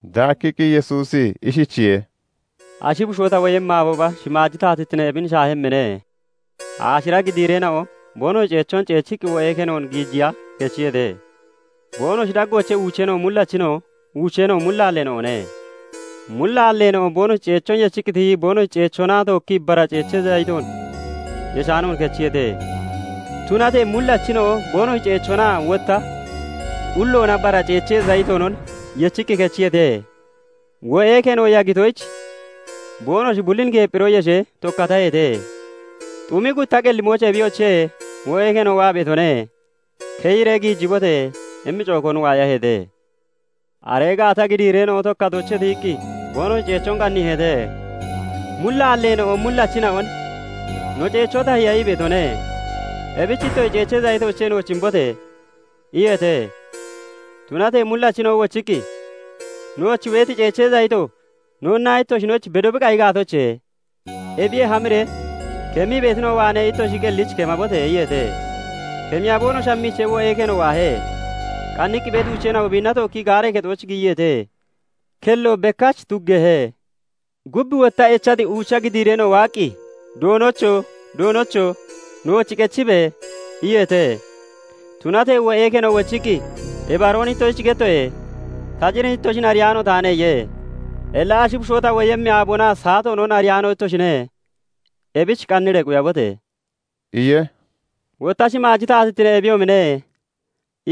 Daakkiqqi Yesuusi ishichiye:- "Ashi bushoo ta woyemmi aabooba shimaaji taatittine ebin shaahemmine; aashira gidiireena'o (giddiideena'o) boonoshi ceechoon ceechiqqi wo'ee kenoon giijiya kechiyeete. Boonoshi daggoochee uucheena'o mullachina'o, uucheena'o mullaalleena'one. mullaalleena'o boonoshi ceechoon yechiqqi tiyii boonoshi ceechoona tookkii bara ceechee zayiton yeshaanoon kechiyeete; Tunatee mullachina'o boonoshi ceechoonaa wotta qulloona bara ceechee zayitonon yechiqqi kechiyeete. Wo'ee keno yagitoyich, boonoshi bullin geephiro yeshee tokkataheete. "Xumi gutta qellimooch 'Ebiyoche, wo'ee keno waa beetone; keyiree giijibote!' immi cookoon waayaheete. "Aree gaata gidiireena'o tokkatoochee tiyiqqi boonoshi ceechoon qanniiheete. Mullaalleena'o mullachina'on 'No ceechoo tahiya ii beetone; ebich ittoshi ceechee zayitoochee nooch imbote!' iyeete. "Tunatee mullachina'o wochiqqi, 'Nooch beeti ceechee zayito noonnaa ittoshinoyich bedo bi qayi gaatoche? Ebiyee hamiree kemmii beetina'o waanee ittoshi qellich kemabote!' iyeete. "Kemiya boonoshi hammiichee, wo'ee keno waahe. Qanniqqi beeti uucheena'o biinna tookkii gaaree kexooch giyiyeete; kello bekkach tuggeehe. "Gub wotta echati uucha gidiireena'o waaqqi, 'Doonocho! Doonocho! Nooch qechibe!' iyeete. "Tunatee wo'ee keno wochiqqi, 'Ibaroon ittoshich gettoye; ta cir ittoshin ariyaano taane' iye. "Illa ashi bushoo ta woyemmi aaboonaa saatoonon ariyaano ittoshine; ebich qanniree quyabote!" iye. "Wotta shimaaji taatittine ebiyoomine;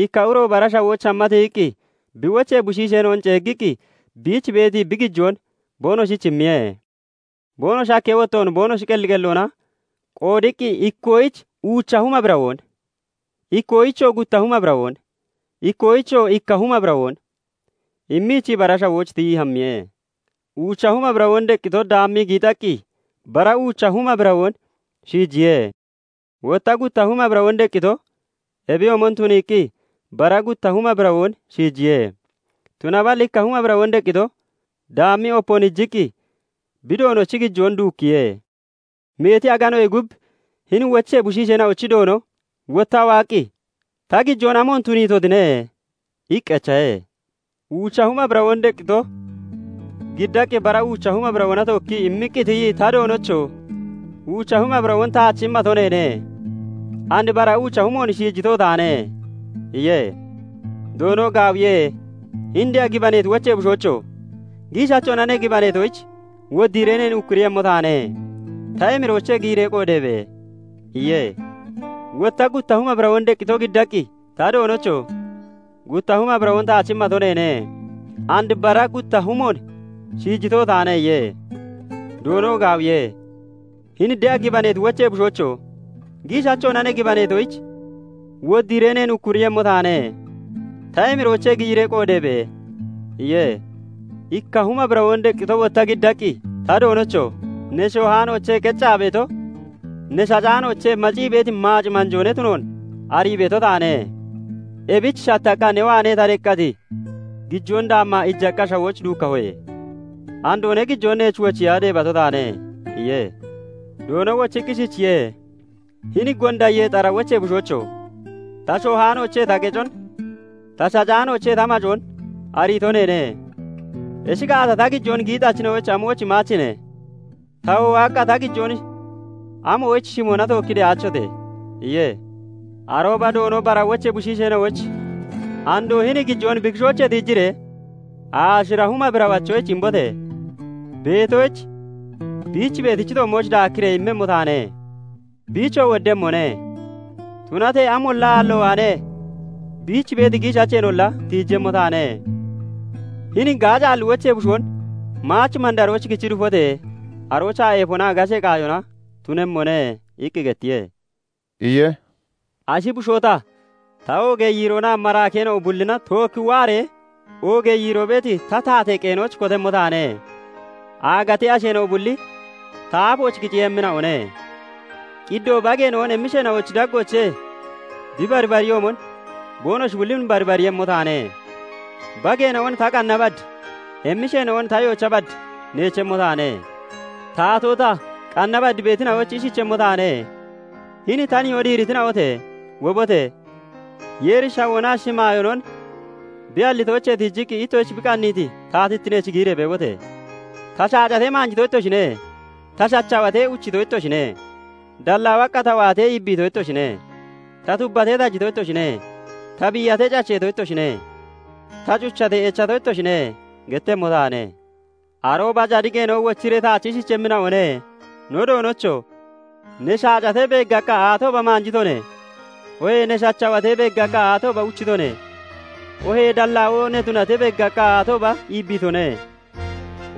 ikka uro bara shawooch hamma tiyiqqi bi wochee bushiisheena'on ceeggiqqi biich beeti bi gijoon boonoshich immiye. Boonoshi hakkee wottoon boonoshi qelli qelloona qoodiqqi ikkoyich uucha huma birawoon, ikkoyichoo gutta huma birawoon, ikkoyichoo ikka huma birawoon immiichii bara shawooch tiyii hammiye. Uucha huma birawoon deqqito daammii giixaqqi bara uucha huma birawoon shiijiye. Wotta gutta huma birawoon deqqito ebiyoomon tuniiqqi bara gutta huma birawoon shiijiye. Tunaballi ikka huma birawoon deqqito daammii opoon iijiqqi bi Doonochi gijoon duukkiye. "Meeti aganoyee gub hini wochee bushiisheena'ochi doono wottaa waaqqi, 'Ta gijoon amoon tuniitotine?' iqqi echahe. "Uuca huma birawoon deqqito giddaqqi bara uucha huma birawoona tookkii immiqqi tiyii, 'Ta doonocho! Uucha huma birawoon taach immato neene; and bara uucha humoon shiijito taane' iye. "Doono 'Gaawiye; hini de'a gibaneeti wochee bushoocho! giishachoona ne gibaneetoyich, woddiiree neen ukkuriiyemmo taane. Ta emiroochee giyiree qoodeebe!' iye. "Wotta gutta huma birawoon deqqito giddaqqi, 'Ta doonocho! Gutta huma birawoon taach immato neene; and bara gutta humoon shiijito taane' iye. "Doono 'Gaawiye; hini de'a gibaneeti wochee bushoocho! Giishachoona ne gibaneetoyich, woddiiree neen ukkuriiyemmo taane. Ta emiroochee giyiree qoodeebe!' iye. "IKka huma birawoon deqqito wotta giddaqqi, 'Ta doonocho! Ne shoohaanoochee qeccaa beeto, ne shacaanoochee macii beeti maac manjoo ne tunoon arii beeto taane. Ebich shattaqqa ne waanee ta deqqati gijoon daammaa iijaqqa shawooch duukkahoye. Andoo ne gijoon neech wochiya deebato taane' iye. "Doono wochiqqi ishichiye:- 'Hini gonda yeexara wochee bushoocho! Ta shoohaanoochee ta qecon, ta shacaanoochee ta macoon ariito neene. Ishi gaata, ta gijoon giixachina'oyich amoyich imaachine? Tawoo waaqqa ta gijoon amoyich shimona tookkii de'aachote?' iye. "Arooba doono bara wochee bushiisheena'oyich 'Andoo hini gijoon bi kishoochee tiijiree aashira huma birawachoyich imbote! Beetoyich, biich beeti toommooch daakkiree immemmo taane; biichoo woddemmone; tunatee amolla aallo waanee biich beeti giishacheenolla tiijemmo taane. Hini gaacaalli wochee bushoon maach mandarooch kichi dufote! Aroochaa eefonaa gashee qaayona tunemmone' iqqi gettiye" iye. "Ashi bushoo ta, ta oogee yiiroona maraakeena'o bullina tookki waaree oogee yiiroo beeti ta taatee qeenooch kotemmo taane; Aagatee asheena'o bulli ta aafooch kiceeyemmina'one. Qiddoo bageena'on emmisheena'ochi daggoochee bi baribariyoomon boonoshi bullin baribariiyemmo taane; Bageena'on ta qanna bad, emmisheena'on ta yoocha bad neechemmo taane. "Taatoo ta, qanna bad beetina'oyich ishichemmo taane; 'Hini ta nihoo diiritina'ote! Wobote! Yeeri shawoonaa shimaayoonon bi hallitoochee tiijiqqi ittoshich bi qanniiti taatittineech giyiree beebote! Ta shaacatee, maanjito ittoshine; ta shachawatee, uchito ittoshine; dallaawaqqa ta waatee, iibbiito ittoshine; Ta tubbatee, tajito ittoshine; ta biiyatee, cacheeto ittoshine; ta cuchatee, echato ittoshine' gettemmo taane. "Arooba cadiqeena'o wochiree taach ishichemmina'one; 'No Doonocho! Ne shaacatee beeggaqqa aatooba maanjitone? Oohee ne hachawatee beeggaqqa aatooba uchitone? Oohee dallaawoo ne tunatee beeggaqqa aatooba iibiitone?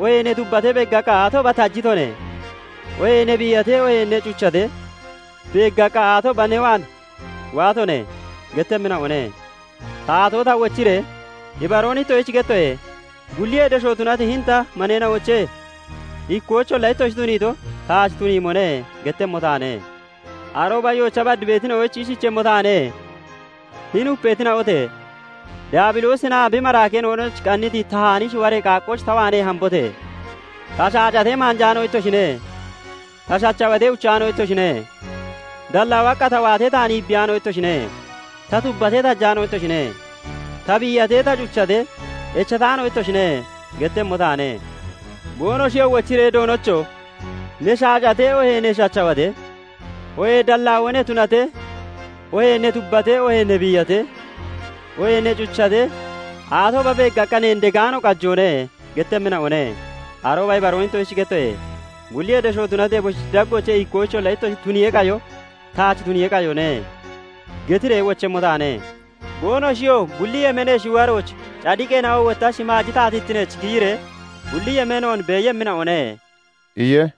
Oohee ne tubatee beeggaqqa aatooba tajitone? Oohee ne biiyatee, oohee ne cuchatee beeggaqqa aatooba ne waan waatone?' gettemmina'one. "Taatoo ta wochiree, 'Ibaroon ittoshich gettoye; bulliyee desho tunati hini ta maneena'oochee ikkoyicholla ittoshi tuniito taach tuniyoomone' gettemmo taane. "Arooba yoocha bad beetina'oyich ishichemmo taane; 'Hini upeetina'ote!Daabiloosinaa bi maraakeena'onoyich qanniti tahaani shiwaree qaaqqooch ta waanee hambote! Ta shaacatee, maanjaano ittoshine; ta shachawatee, uchaano ittoshine; dallaawaqqa ta waatee, taan iibbiyaano ittoshine; ta tubbatee, tajaano ittoshine; ta biiyatee, ta cuchatee, echataano ittoshine' gettemmo taane. "Boonoshiyoo wochiree, 'Doonocho! Ne shaacatee, oohee ne shachawatee, oohee dallaawoo ne tunatee, oohee ne tubbatee, oohee ne biiyatee, oohee ne cuchatee, aatooba beeggaqqa neen degaano qajoone?' gettemmina'one. "Arooba 'ibaroon ittoshich gettoye; bulliyee desho tunati eboshi daggoochee ikkoyicholla ittoshi tuniyee qayo taach tuniyee qayone' getiree wochemmo taane. "Boonoshiyoo bulli yemeenee shiwarooch, cadiqeena'o wotta shimaaji taatittineech giyiree bulli yemeenoon beeyemmina'one" iye.